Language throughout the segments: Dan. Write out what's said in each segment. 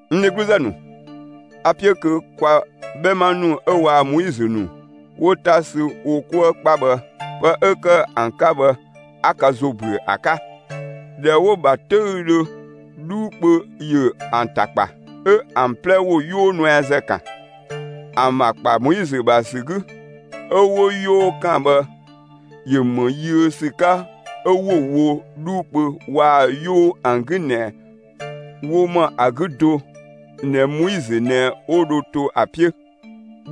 N dhegluzë ‑nu, a‑ 'piö kö kwa 'bhɛma ‑nu 'ö waa‑ Moizö ‑nu 'wo 'ta sü wo 'kuë 'kpa bhë, pë 'ö ‑kë ‑an 'ka bhë, 'a ka ‑zo ‑yö ‑büö ‑a 'ka. ꞊Dhɛ 'wo‑ ‑bha 'töüdhö, 'dhuu kpö ‑yö ‑an ‑ta ‑kpa, 'ö ‑an 'plɛ ‑wo 'yoo nuɛazë ‑kan. ‑An ‑bha ‑kpa Moizö ‑bha ‑sü 'gü, 'ö 'wo 'yoo ‑kan bhë ‑yö ‑më yiö ‑sü 'ka 'ö 'wo‑ wo 'dhuu kpö waa‑ 'yoo ‑an 'gü ꞊nɛ ‑wo ‑mɔ ‑a 'gü do ꞊nɛ Moizö ꞊nɛ 'wo dho to ‑a 'piö.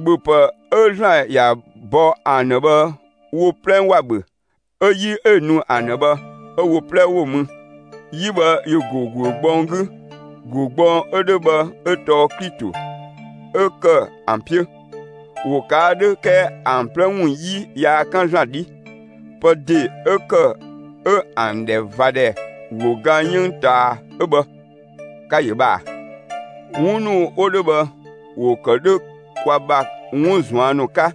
‑Bhöpë 'ö ‑Zlan ‑ya bɔ ‑an ‑dhë bhë wo 'plɛ ‑wa ‑bhö, 'ö 'yi 'ö‑ nu ‑an ‑dhë bhë 'ö wo 'plɛ 'wo‑ mü. 'Yi bhë ‑yö ‑go ‑guö gbɔng 'gü. ‑Guö gbɔng 'ö 'dhö bhë 'ö tɔɔ Klito 'ö ‑kë ‑an 'piö. ‑Wo ꞊kaa' 'dhö 'kɛɛ ‑an 'plɛ ‑wun 'yi yaa 'kan ‑Zlan 'dhi. Pë ‑de 'ö ‑kë 'ö ‑an ‑dhɛ ꞊va ‑dhɛ ‑wo ga 'yënng ꞊taa 'ö bhë. Ka‑ ‑yö bhë ꞊a! 'Wun ‑nu 'wo 'dhö bhë, ‑wo ‑kë 'dhö kwa ‑bha 'wun ꞊zuan' ‑nu 'ka,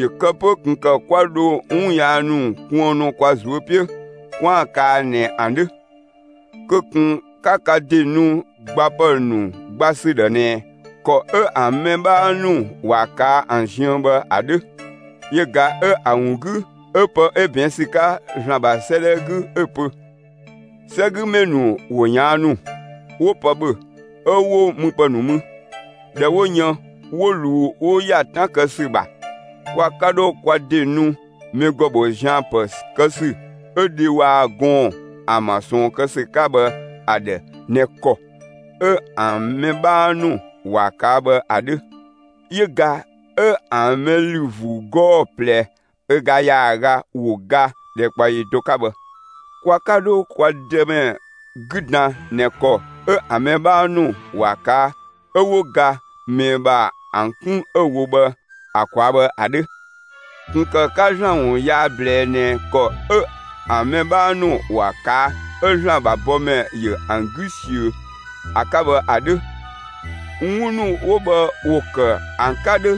‑yö kë 'pö ꞊kun ‑kë kwa ‑dho 'wun yaa ‑nu kuënnu kwa ꞊zuö' 'piö 'kwaan‑ kaa ꞊nɛ ‑an 'dhö. Kö ꞊kun 'ka ka ‑de nu gbapë ‑nu gba ‑sü ‑dhë ꞊nɛ ‑kɔ 'ö ‑an mɛ 'bhaa ‑nu ‑wa ꞊kaa' ‑an ziën bhë ‑a 'dhö; yö ꞊ga 'ö‑ ‑wun 'gü 'ö pë 'ö ꞊bɛɛn' ‑sü 'ka ‑Zlan ‑bha 'sëëdhɛ 'gü 'ö‑ pö: 'Sɛgümɛ ‑nu ‑wo ꞊yaannu, 'wo pë ‑bhö 'ö 'wo müpë ‑nu mü. ꞊Dhɛ 'wo yën, 'wo ꞊luu 'wo ‑ya 'tan kë ‑sü ‑bha. Kwa 'ka 'dho kwa ‑de nu mɛ ‑gɔ ‑bho zian‑ ‑pë kë ‑sü 'ö dhe waa‑ gɔɔn‑ ‑an ‑bha ꞊sɔɔn kë ‑sü 'ka bhë ‑a ‑dhë ꞊nɛ ‑kɔ 'ö ‑an mɛ 'bhaa ‑nu ‑wa ꞊kaa' bhë ‑a 'dhö. Yö ꞊ga 'ö ‑an mɛ ‑lü ‑vuu 'gɔɔ‑ ꞊plɛ ö ga ‑yaaga 'wo ga ‑dhɛkpaɔyi do 'ka bhë. Kwa 'ka 'dho kwa Dëmɛ 'gü dan ꞊nɛ ‑kɔ 'ö ‑an mɛ 'bhaa ‑nu ‑wa ꞊kaa' 'ö 'wo ga ꞊mɛɛ ‑bha ‑an 'kun 'ö‑ wo bhë ‑a ꞊kwaa' bhë ‑a 'dhö. ꞊Kun ‑kë 'ka ‑Zlan ‑wun yaa ꞊blɛɛ ꞊nɛ ‑kɔ 'ö ‑an mɛ 'bhaa ‑nu ‑wa ꞊kaa' 'ö ‑Zlan ‑bha bɔmɛ ‑yö ‑an 'gü ꞊siö ‑a 'ka bhë ‑a 'dhö. 'Wun ‑nu 'wo bhë ‑wo ‑kë ‑an 'ka 'dhö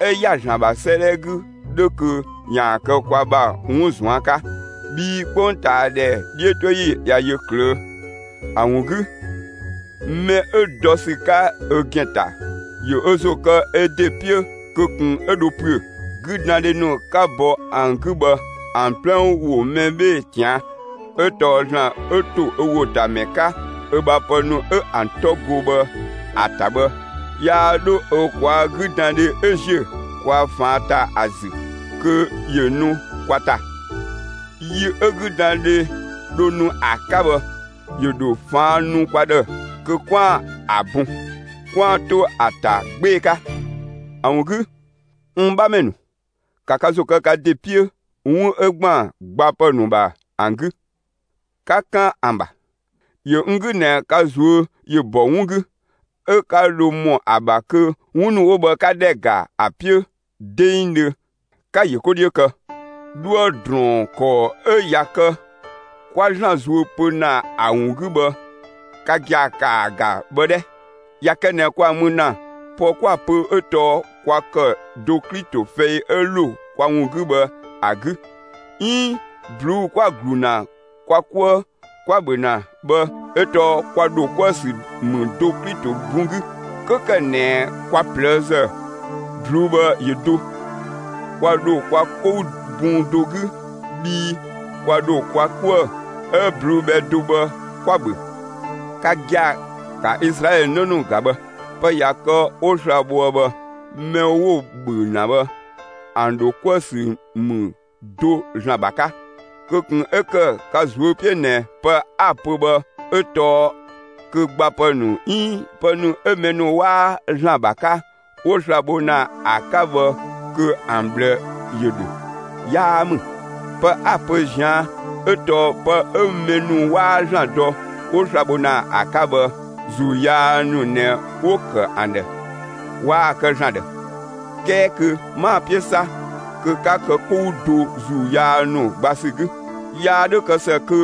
'ö ‑ya ‑Zlan ‑bha 'sëëdhɛ 'gü 'dhö kö ‑yaan kë kwa ‑bha 'wun ꞊zuan' 'ka. Bhii 'kpongtaadhɛ 'dhiötoyi ꞊ya yö ꞊klöö'. ‑A ‑wun 'gü, mɛ 'ö dɔ ‑sü 'ka ö ‑gɛn ‑ta, ‑yö ö ‑zo kë ö ‑de 'piö kö ꞊kun 'ö dho ‑püö. 'Güdandhe ‑nu 'ka bɔ ‑an 'gü bhë ‑an 'plɛ ‑wo mɛ 'bhee‑ ꞊tian'; 'ö tɔɔ ‑Zlan 'ö ‑to ‑wo ‑ta ‑mɛ 'ka ö ‑bha pë ‑nu 'ö ‑an 'tɔ go bhë ‑a ‑ta bhë, yaa 'dho ö ꞊kwaa' 'güdandhe 'ö ‑ziö kwa ꞊faan' ‑ta ‑a ‑zü kö ‑yö nu kwa ‑ta. Yi 'ö 'güdandhe dho nu ‑a 'ka bhë, ‑yö ‑dho ꞊faan' nu kwa ‑dhë kö 'kwaan‑ ‑a bun, 'kwaan‑ to ‑a ‑ta 'gbee‑ 'ka. ‑A ‑wun 'gü, n 'bhamɛ ‑nu, ‑ka ka ‑zo kë ka ‑de 'piö 'wun 'ö ‑gban gbapë ‑nu ‑bha ‑an 'gü; ‑ka 'kan ‑a ‑bha! ‑Yö n 'gü ꞊nɛ ka ꞊zuö' ‑yö ‑bɔ 'wun 'gü, 'ö 'ka dho ‑mɔ ‑a ‑bha kö 'wun ‑nu 'wo bhë 'ka ‑dhɛ ‑ga ‑a 'piö 'dengdhö, 'ka‑ ‑yö 'ko 'dhiö kë. 'Dhuë‑ ‑drɔɔn ‑kɔɔ 'ö ‑ya kë 'kwa ‑Zlan zuö pö ‑na ‑a ‑wun 'gü bhë ka gia‑ ‑kaa ‑ga bhë 'dhɛ! ꞊Ya kë ꞊nɛ kwa‑ mü ‑na, pë 'kwa‑ pö 'ö tɔɔ 'kwa ‑kë do Klito fɛi 'ö ‑lo kwa ‑wun 'gü bhë ‑a 'gü, 'iin ꞊bluu'‑ 'kwa‑ ‑glu ‑na kwa 'kuë 'kwa‑ ‑bhö ‑na bhë 'ö tɔɔ kwa ‑dho 'kuë‑ ‑sü ‑mü do Klito bun 'gü. 'Kö ‑kë ꞊nɛ kwa ꞊plëëzë, ꞊bluu'‑ bhë ‑yö do; kwa ‑dho kwa 'kou bun do 'gü bhii kwa ‑dho kwa 'kuë‑ 'ö ꞊bluu'‑ bhɛ do bhë 'kwa‑ ‑bhö. Ka gia‑, ‑ka Izlaɛlö 'në ‑nu ‑ga bhë! Pë ꞊ya kë 'wo sla‑ bhoë bhë, mɛ 'wo‑ ‑bhö ‑na bhë, ‑an ‑dho 'kuë‑ ‑sü ‑mü do ‑Zlan ‑bha 'ka. Kö ꞊kun 'ö ‑kë ka ꞊zuö' 'piö ꞊nɛ pë 'a‑ pö bhë 'ö tɔɔ kö gbapë ‑nu 'iin pë ‑nu 'ö mɛ ‑nu 'waa ‑Zlan ‑bha 'ka, 'wo sla‑ bho ‑na ‑a 'ka bhë kö ‑an ꞊bhlë ‑yö ‑dhö. 'Yaa ‑mü. Pë 'a‑ pö ꞊zian' 'ö tɔɔ pë 'ö mɛ ‑nu 'waa ‑Zlan dɔ, 'wo sla‑ bho ‑na 'ka bhë, ‑zuu yaa ‑nu ꞊nɛ 'wo‑ ‑kë ‑an ‑dhë, waa‑ kë ‑Zlan ‑dhë; 'kɛɛ kö 'maa‑ 'piö 'sa kö 'ka kë 'kou do ‑zuu yaa ‑nu gba ‑sü 'gü. Yaa 'dhö kë ‑së kö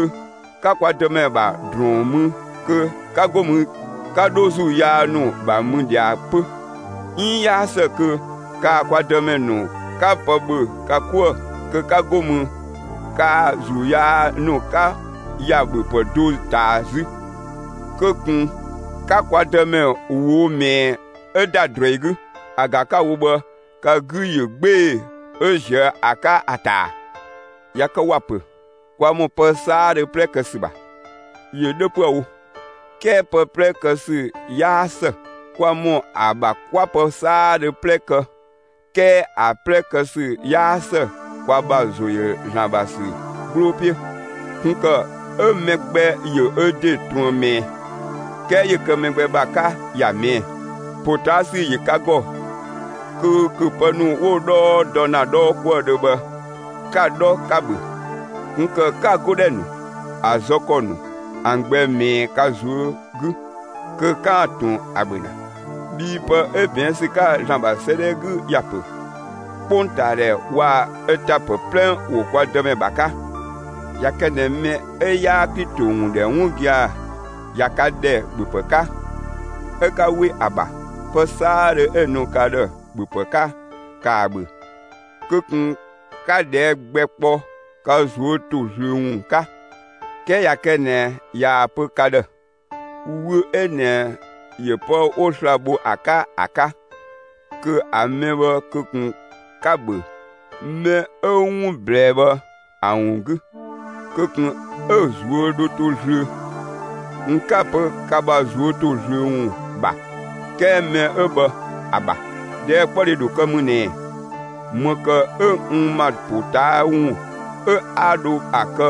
'ka kwa Dëmɛ ‑bha ‑drɔɔn mü kö 'ka 'go mü 'ka 'dho ‑zuu yaa ‑nu ‑bha mü ꞊dhia 'pö; 'iin 'yaa ‑së kö kaa‑ kwa Dëmɛ ‑nu 'ka pë ‑bhö ka 'kuë‑ kö 'ka 'go mü, kaa‑ ‑zuu yaa ‑nu 'ka ‑ya ‑bhöpë do ꞊taa 'zü. Kö ꞊kun 'ka kwa Dëmɛ ꞊woo' ꞊mɛɛ 'ö ‑da ꞊druɛi 'gü. ‑A ‑ga 'ka‑ wo bhë ka 'gü ‑yö 'gbee‑ 'ö ‑ziö ‑a 'ka ‑a ‑ta ‑a? ꞊Ya kë ‑wa ‑pö: «Kwa ‑mɔ pë 'saadhö 'plɛ kë ‑sü ‑bha.» ‑Yö 'dhö 'püë‑ wo 'kɛɛ pë 'plɛ kë ‑sü 'yaa ‑së. Kwa ‑mɔ ‑a ‑bha 'kwa pë 'saadhö 'plɛ ‑kë 'kɛɛ ‑a 'plɛ kë ‑sü 'yaa ‑së kwa ‑bha ‑zo ‑yö ‑Zlan ‑bha ‑sü 'gbloo 'piö. ꞊Kun ‑kë 'ö mɛ gbɛ ‑yö ö ‑de ꞊truën ꞊mɛɛ; 'kɛɛ ‑yö kë mɛ gbɛ ‑bha 'ka, ‑ya ꞊mɛɛ'‑. ‑Potaasü ‑yö ka ‑gɔ kö ‑köpë ‑nu 'wo‑ 'dhɔɔ dɔ ‑na 'dhɔɔkuëdhö bhë 'ka‑ 'dhɔ 'ka‑ ‑bhö; ꞊kun ‑kë 'ka‑ 'godhɛ ‑nu, ‑a zë ‑kɔ ‑nu, ‑an gbɛ ꞊mɛɛ ka ꞊zuö' 'gü, kö 'kaan‑ ꞊tun ‑a ‑bhö ‑na. Bhii pë 'ö ꞊bɛɛn' ‑sü 'ka ‑Zlan ‑bha 'sëëdhɛ 'gü ‑ya ‑pö: 'Kpongtaadhɛ waa‑ ö ‑ta ‑pë 'plɛ ‑wo kwa Dëmɛ ‑bha 'ka. ꞊Ya kë ꞊nɛ mɛ 'ö 'yaa Klito ‑wun ‑dhɛ 'wun gia‑ ꞊ya ka ‑dhɛ ‑bhöpë 'ka, 'ö 'ka 'we ‑a ‑bha, pë 'saadhö 'ö‑ nu ka ‑dhë ‑bhöpë 'ka, ‑kaa ‑bhö; kö ꞊kun 'ka ꞊dhɛɛ' gbɛ kpɔ ka ꞊zuö' ‑to zlöö ‑wun 'ka. 'Kɛɛ ꞊ya kë ꞊nɛ ꞊yaa‑ pö ka ‑dhë: «Wü 'ö ꞊nɛ ‑yö pë 'wo sla‑ bho ‑a 'ka ‑a 'ka», kö ‑a mɛ bhë kö ꞊kun 'ka‑ ‑bhö mɛ 'ö 'wun ꞊blɛɛ bhë ‑a ‑wun 'gü, kö ꞊kun 'ö‑ ꞊zuö' dho to zlöö. N 'kaa‑ pö ka ‑bha ꞊zuö' ‑to zlöö ‑wun ‑bha, 'kɛɛ mɛ 'ö bhë ‑a ‑bha. ꞊Dhɛɛkpɔdhe ‑dho kë ‑mü ꞊nɛ: ‑Më ‑kë 'ö n ‑ma ‑po ꞊taa' ‑wun 'ö 'a dho ‑a kë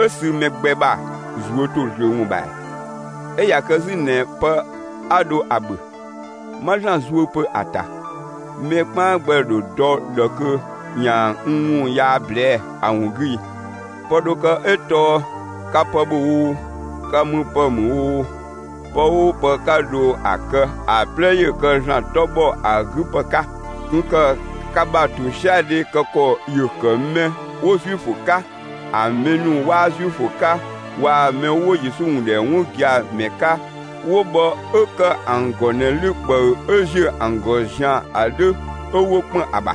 'ö sü mɛ gbɛ ‑bha ꞊zuö' ‑to zlöö ‑wun ‑bha ‑ɛɛ? 'Ö ꞊ya kë 'zü ꞊nɛ pë 'a dho ‑a ‑bhö, 'ma ‑Zlan zuö pö ‑a ‑ta, mɛ 'kpaan gbɛ ‑dho dɔ ꞊dhë kö ‑yaan n ‑wun yaa ꞊blɛɛ' ‑a ‑wun 'gü ii? Pë dho kë 'ö tɔɔ ka pë ‑bhö oo, ka müpë ‑mü oo, pë 'oo pë 'ka dho ‑a kë, ‑a 'plɛ ‑yö kë ‑Zlan 'tɔ ‑bhɔ ‑a 'gü ‑pë 'ka. ꞊Kun ‑kë ka ‑bha ‑tosiadhe kë ‑kɔ ‑yö ‑kë mɛ 'wo Zuifö 'ka, ‑a mɛ ‑nu 'waa Zuifö 'ka waa‑ mɛ 'wo Yesu ‑wun ‑dhɛ 'wun gia‑ ‑mɛ 'ka 'wo bhë 'ö ‑kë ‑an ‑gɔ ꞊nɛ 'lü ꞊kpëü 'ö ‑ziö ‑an ‑gɔ zian‑ ‑a 'dhö 'ö 'wo ‑kpën ‑a ‑bha.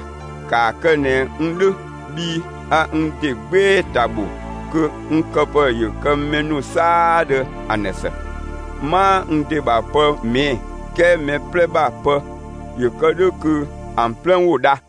‑Kaa kë ꞊nɛ n 'dhö bhii a n ‑de 'gbee‑ ‑ta ‑bho kö n këpë ‑yö kë mɛ ‑nu 'saadhö ‑an ‑dhë ‑së. 'Maa n ‑de ‑bha pë ꞊mɛɛ'‑; 'kɛɛ mɛ 'plɛ ‑bha pë, ‑yö kë 'dhö kö ‑an 'plɛ ‑wo dha.